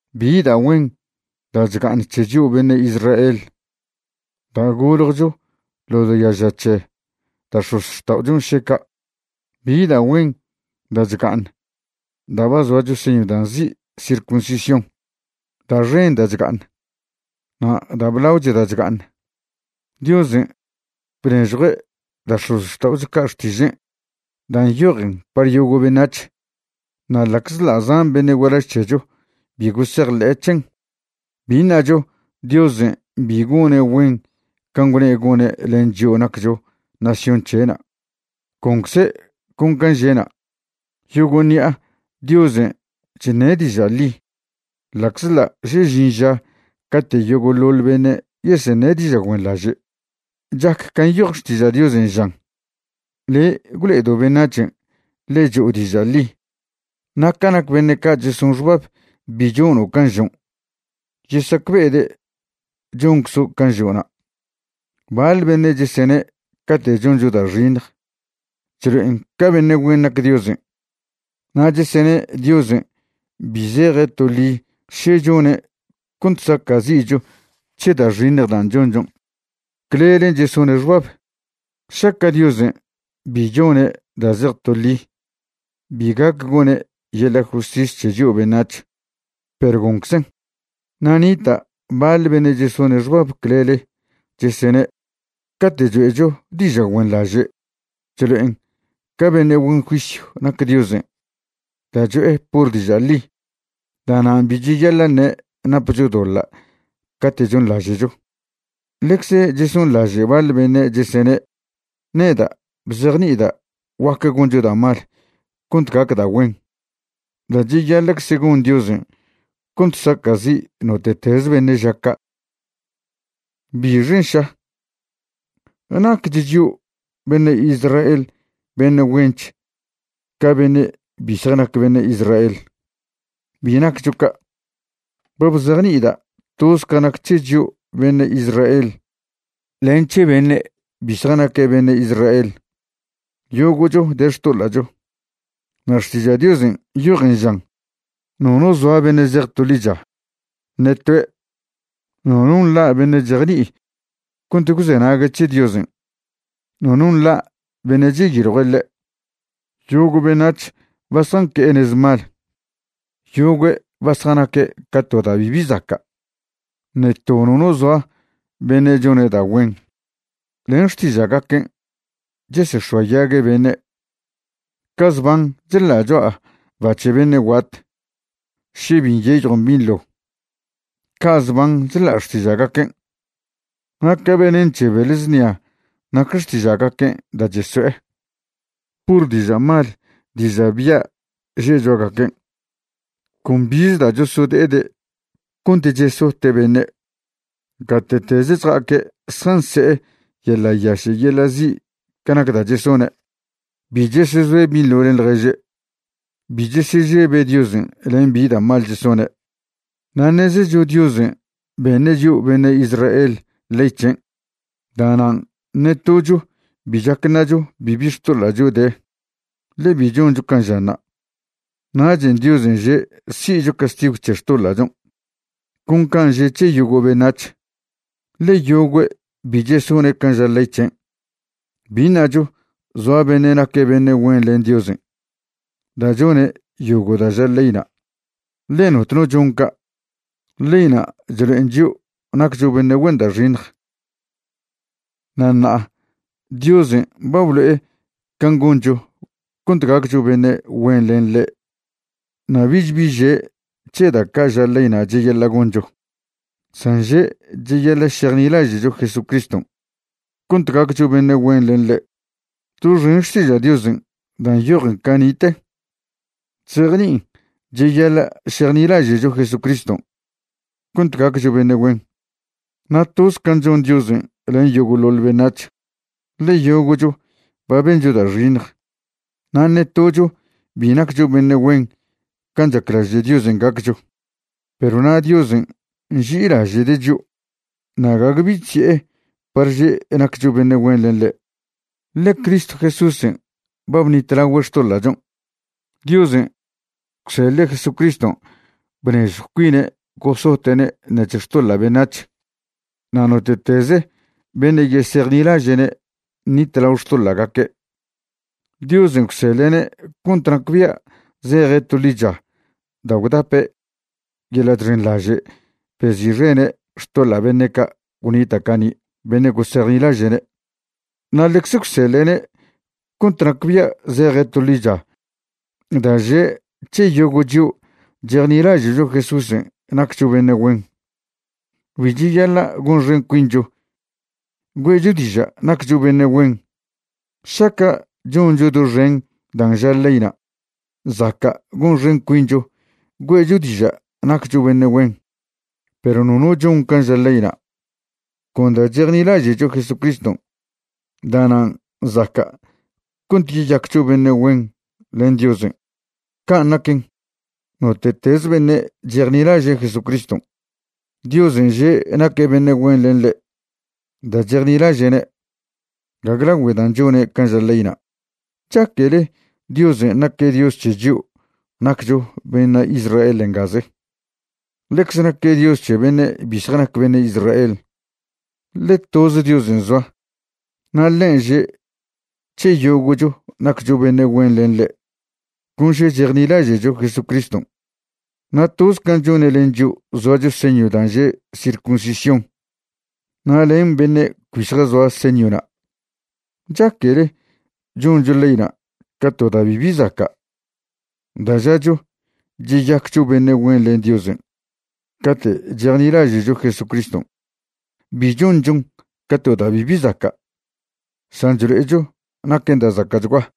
¿Bi da' güen da' chga'aṉ c̱he chio' beṉe' Israel da' goljcho ḻo diaža c̱he da' x̱ozxta'ochon' še ca'? ¿Bi da' güen da' chga'aṉ da' ba zoacho señw da' nzi' circuncisión? Da' xen da' chga'aṉ. Na' da' blaoch da' chga'aṉ, Diosen' bnežjue' da' x̱ozxta'ocho ca' Xtižen' da' nyojen par yogo' beṉac̱h. Na' ḻa'czḻa' zan beṉe' gualaž c̱hecho bi gosejḻe'e c̱hen, bi ṉacho Diosen' bi gone' güen can' gwne' gone' len chio' naccho nación c̱he'na'. Goncze' con can' že'na'. Yogo' ṉi'a Diosen' chṉe' diža' ḻi, ḻa'czḻa' še žin ža cate' yogo'ḻoḻ beṉe' yeseṉe' diža' güenḻaže'. Chac can' nyoj Xtiža' Diosen' žan: Le' gwlo'edo' beṉac̱hen' ḻe cho'o diža' ḻi. Na' ca nac beṉe' ca' cheson xbab bi chono' can' žon', yesacbe'ede' chonczo' can' žo'na'. Baḻ beṉe' chesene' cate' choncho da' xiṉj chlo'en ca beṉe' güen nac Diosen', na' chesene' Diosen' bi zeje' to ḻi še chone' cont saca'zi'cho c̱he da' xiṉj dan' chonchon'. Clelen' chesone' xbab. Šaca' Diosen' bi chone' da' zej toḻi, bi gac gone' yeḻa' justis c̱he chio' beṉac̱h. Perw gonczen'. Na' nita' baḻ beṉe' chesone' xbab clele, chesene': “Cate' choe'cho diža' güenḻaže' chlo'en ca beṉe' güen juisyw nac Diosen' da' cho'e pur diža' ḻi. Da'nan' bi cheyaḻa' ṉe' napcho doḻa' cate' chonḻaže'cho.” Ḻecze chesonḻaže' baḻ beṉe' chesene' neda' bzejni'ida' guaque goncho da' mal cont gac da' güen. Da' cheyaḻa'cze gon Diosen' cont sacazi' note'tez beṉe' ža ca'. ¿Bixen' ša? ¿Naquech chio' beṉe' Israel beṉe' güench ca beṉe' bi zjanac beṉe' Israel? Bi naccho ca'. Ba bzejni'ida' toz ca nac c̱he chio' beṉe' Israel len c̱he beṉe' bi zjanaque' beṉe' Israel, yogo'cho de xtoḻa'cho. Na' Xtiža' Diosen' nyojen žan: Nono zoa beṉe' zej to ḻicha, ṉe toe'. Nono nḻa' beṉe' chejni'i cont gwzenague' c̱he Diosen', nono nḻa' beṉe' cheyiljue' ḻe'. Yogo' beṉac̱h ba zjanque'e nez mal. Yogüe' ba zjanaque' ca to da' bibi zaca'. Ṉe to nono zoa beṉe' chone' da' güen. Len xtiža'gaquen' chesex̱oayague' beṉe'. Ca zban chḻa' cho'a ba c̱he beṉe' guat še bi nyeyjon binḻo, ca' zban chḻa' xtiža'gaquen'. Na' ca venen c̱he beḻ znia nac xtiža'gaquen' da' cheso'e. Pur diža' mal diža' bya' že' cho'agaquen'. Con bize da' chosode'ede' cont chesote' beṉe'. Gate'teze chja'aque' zjanse'e yeḻa' yaše' yeḻa' zi' ca nac da' chesone'. Bi chesezoe' binḻo len ḻježe'. Bi chesežebe' Diosen' len bi da' mal chesone'. Na' ṉezecho Diosen' beṉe' chio' beṉe' Israel ley c̱hen'. Da'nan' ṉe tocho bi chac ṉacho bibi xtoḻa'cho de, ḻe bi choncho can' žanṉa'. Nachen' Diosen' že' si'cho castigw c̱he xtoḻa'chon', con can' že' c̱he yogo' beṉac̱h, ḻe yogüe' bi chesone' can' ža ley c̱hen'. Bi ṉacho zoa beṉe' naque' beṉe' güen len Diosen' da' chone' yogo' da' ža leyna', ḻe notno chon ca'. Leyna' chlo'en chio' naccho beṉe' güen da' xiṉj. Na' ṉa'a Diosen' ba blo'e can' goncho cont gaccho beṉe' güen len ḻe', na' bich bi že' c̱he da' ca' ža leyna' cheyaḻa' goncho, san že' cheyaḻa' šejnilaže'cho Jesucriston' cont gaccho beṉe' güen len ḻe'. Doxen Xtiža' Diosen' dan' nyojen cani'te chzejni'in cheyaḻa' šejnilaže'cho Jesucriston' cont gaccho beṉe' güen. Na' toz can' chon Diosen' len yogo'ḻoḻ beṉac̱h. Ḻe yogo'cho ba bencho da' xiṉj, na' ṉe tocho bi naccho beṉe' güen can' chaclaže' Diosen' gaccho. Perw na' Diosen' nži'ilaže'de' chio', na' gague bi chzi'e par že' naccho beṉe' güen len ḻe', ḻe Cristo Jesúsen' ba bṉitlagüe' xtoḻa'chon'. Diosen' gwseḻe' Jesucriston' bnežjw cuine' gosote'ne' ṉec̱he xtoḻa' beṉac̱h. Na' note'teze beṉe' yesejnilaže'ne' ṉitlao xtoḻa'gaque'. Diosen' gwseḻe'ne' cont nacbia' zeje' to ḻicha da' gwdape' yeḻa' chxenḻaže' bezi'xene' xtoḻa' beṉe' ca' gwnita' cani' beṉe' gosejnilaže'ne'. Na' ḻecze gwseḻe'ne' cont nacbia' zeje' to ḻicha da' že' c̱he yogo' chio' chejnilaže'cho Jesúsen' naccho beṉe' güen. Bi cheyaḻa' gonxen cuincho güe'cho diža' naccho beṉe' güen. Šaca' choncho doxen dan' ža ḻeyna' zaca' gonxen cuincho güe'cho diža' naccho beṉe' güen, perw nono chon can' ža leyna'. Con da' chejnilaže'cho Jesucriston', da'nan' zaca' cont yeyaccho beṉe' güen len Diosen'. Can' naquen, note'tez beṉe' chejnilaže' Jesucriston', Diosen' že' naque' beṉe' güen len ḻe' da' chejnilaže'ne', gague lagüe dan' chone' can' ža ḻeyna'. ¿Chaquele Diosen' naque' Dios c̱he chio' naccho beṉe' Israel ngaze? Ḻecze naque' Dios c̱he beṉe' bi zjanac beṉe' Israel. Ḻe toze Diosen' zoa na' ḻen' že' c̱he yogo'cho naccho beṉe' güen len ḻe' con še chejnilaže'cho Jesucriston', na' toz can' chone' len chio' zoacho señw dan' že' circuncisión na' len beṉe' cbi zjazoa señwna'. ¿Chaquele choncho leyna' ca to da' bibi zaca' da' žacho cheyaccho beṉe' güen len Diosen' cate' chejni'laže'cho Jesucriston'? Bi chonchon ca to da' bibi zaca', san chlo'echo naquen da' zaca'chgua.